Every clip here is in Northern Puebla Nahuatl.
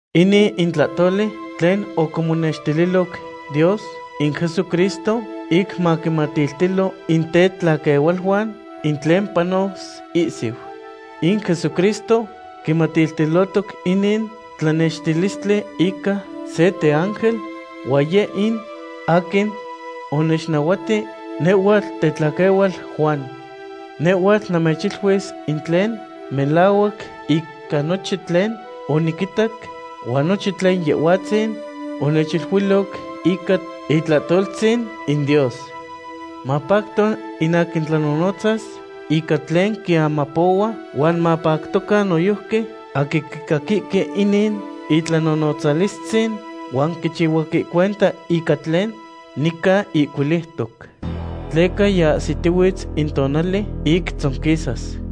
Inin in tlahtoli tlen oquimonextililoc Dios in Jesucristo ic maquinmatiltilo in tetlaquehualuan in tlen panos ihsiu. In Jesucristo quimatiltilotoc inin tlanextilistli ica se teángel, huan yeh in aquin onechnahuati nehhuatl tetlaquehual Juan. Nehhuatl namechiluis in tlen melahuac ica nochin tlen oniquitac huan nochin tlen Yehhuatzin onechiluiloc ica itlahtoltzin in Dios. Mapacto in aquin tlanonotzas ica tlen quiamapohua huan mapactocan noyojqui aquin quicaquihque inin itlanonotzalistzin, huan quichihuahque cuenta ica tlen nica ihcuiliutoc. Tleca yiahsitihuitz in tonali ic tzonquisas.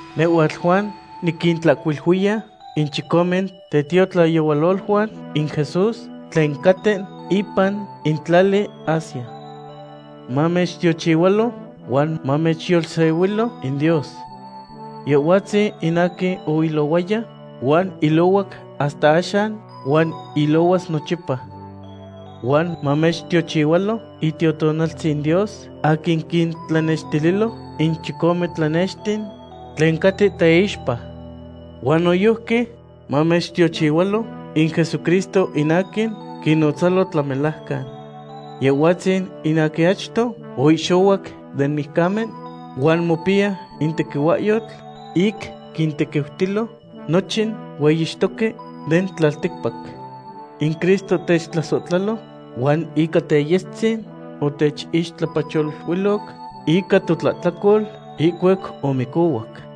Nehhuatl Juan, niquintlahcuiluiya in chicome tetiotlayehualoluan in Jesús tlen caten ipan in tlali Asia. Mamechtiochihualo huan mamechyolsehuilo in Dios. Yehhuatzin in aquin oilohuaya, huan ilohuac hasta axan, huan ilohuas nochipa. Huan mamechtiochihualo Itiotonaltzin Dios aquin quintlanextililo in chicome tlanexten tlen caten teixpa. Huan noyojqui mamechtiochihualo in Jesucristo in aquin quinnonotzalo tlamelajcan. Yehhuatzin in aquin achto oihxohuac den mijcamen huan mopiya in tequihuahyotl ic quintequiutilo nochin hueyixtoque den tlalticpac. In Cristo techtlasohtlalo huan ica teyestzin otechixtlapacholuiloc ica totlahtlacol ihcuac omicohuac.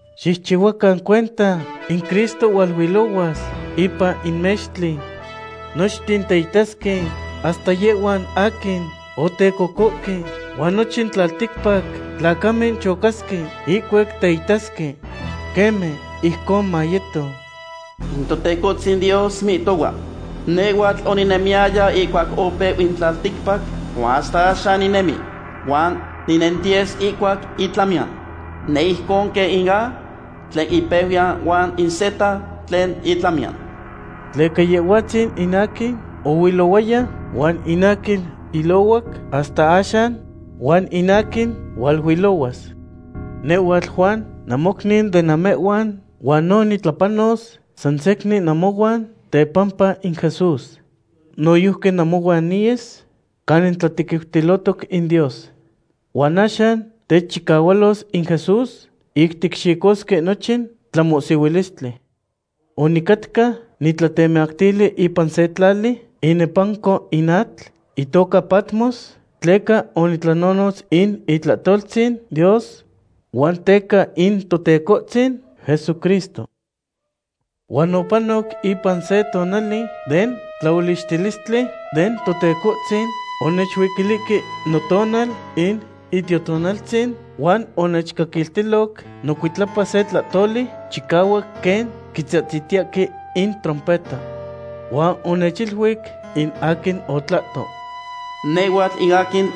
¡Xicchihuacan cuenta! ¡In Cristo hualuilohuas ipan in mextli! Nochten teitasque, hasta yehhuan aquin otecocohque, huan nochin tlalticpac tlacamen chocasque ihcuac teitasque. Queme, ijcon mayeto. In Totecohtzin Dios mihtohua: “Nehhuatl oninemiyaya ihcuac opeu in tlalticpac, huan hasta axan ninemi, huan ninentiyes ihcuac itlamiyan. Neh ijcon quen in A tlen ipeuyan huan in Z tlen itlamiyan.” Tleca Yehhuatzin in aquin oilohuaya, huan in aquin ilohuac hasta axan, huan in aquin hualuilohuas. Nehhuatl Juan namocniu de namehhuan huan no nitlapanos san secnin namohuan tepampa in Jesús. Noyojqui namohuan niyes canin tlatequiutilo in Dios. Huan axan techchicahualos in Jesús ic ticxicosque nochin tlamohsihuilistli. Onicatca nitlatemactili ipan se tlali inepanco in atl, itoca Patmos, tleca onitlanonotz in itlahtoltzin Dios huan teca in Totecohtzin Jesucristo. Huan opanoc ipan se tonali den tlaolichtilistli den Totecohtzin, onechuiquilihque notonal in Itiotonaltzin, huan onechcaquiltiloc nocuitlapa se tlahtoli chicahuac quen quitzahtziltiyahque in trompeta. Huan onechiluic in aquin otlahto: ―Nehhuatl in aquin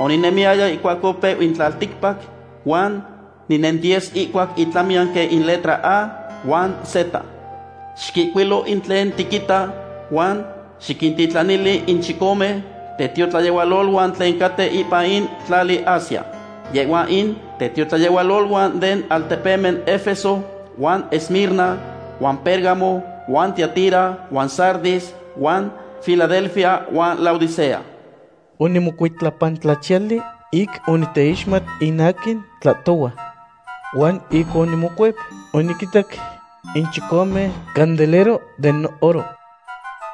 oninemiyaya ihcuac opeu in tlalticpac huan ninentiyes ihcuac itlamiyan quen in letras A huan Z. Xiquihcuilo in tlen tiquita huan xiquintitlanili in chicome tetiotlayehualoluan tlen caten ipan in tlali Asia. Yehhuan in tetiotlayehualoluan den altepemen Efeso huan Esmirna huan Pérgamo huan Tiatira huan Sardis huan Filadelfia huan Laodicea. Onimocuitlapantlachiyali ic oniteixmat in aquin tlahtohua. Huan ic onimocuep, oniquinitac in chicome candelero den oro.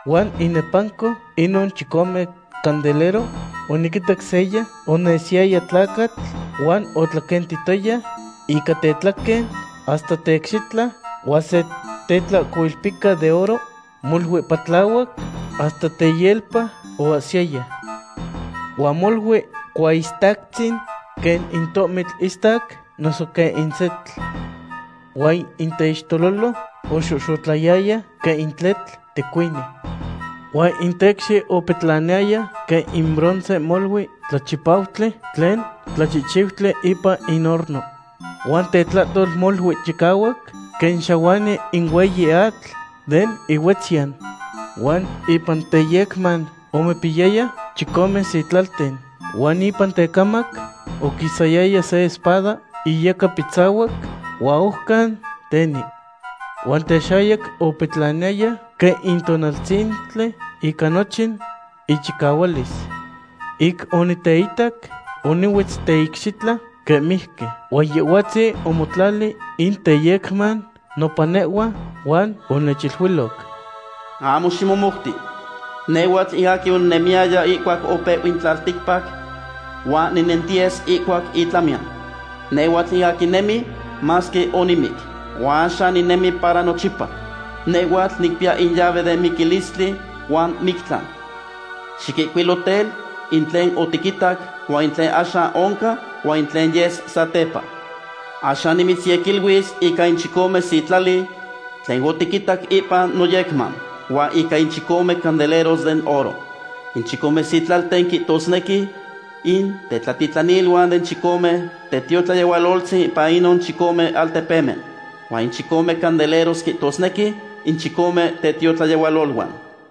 Huan inepanco inon chicome candelero oniquitac seya onesiyaya tlacatl huan otlaquentihtoya ica tetlaquen hasta teicxitla huan se tetlahcoilpica de oro molui patlahuac hasta teyelpa oahsiyaya. Huan molui cuaistactzin, quen in tohmitl istac noso quen in setl. Huan in teixtelolo oxohxotlayaya quen in tletl tecuini. Huan in tecxi opetlaniyaya quen in bronce molui tlachipautli, tlen tlachihchiutli ipan in horno. Huan tetlahtol molui chicahuac quen xahuani in hueyi atl den ihuetzyan. Huan ipan teyecman omopiyaya chicome sitlalten. Huan ipan tecamac oquisayaya se espada iyecapitzahuac huan ojcan teni. Huan texayac opetlaniyaya quen in tonaltzintli ica nochin ichicahualis. Ic oniteitac, onihuetz teicxitla quen mijqui, huan Yehhuatzin omotlali in teyecman nopan nehhua, huan onechiluiloc: ―Ahmo ximomouti. Nehhuatl in aquin oninemiyaya ihcuac opeu in tlalticpac huan ninentiyes ihcuac itlamiyan. Nehhuatl in aquin nemi, masque onimic. Huan axan ninemi para nochipa. Nehhuatl nicpiya in llave den miquilistli huan mictlan. Xiquihcuilo tel, in tlen otiquitac, huan in tlen axan oncan, huan in tlen yes satepa. Axan nimitzyequiluis ica in chicome sitlali tlen otiquitac ipan noyecman, huan ica in chicome candeleros den oro. In chicome sitlalten quihtosnequi in tetlatitlaniluan den chicome tetiotlayehualoltzin ipan inon chicome altepemen. Huan in chicome candeleros quihtosnequi in chicome tetiotlayehualoluan.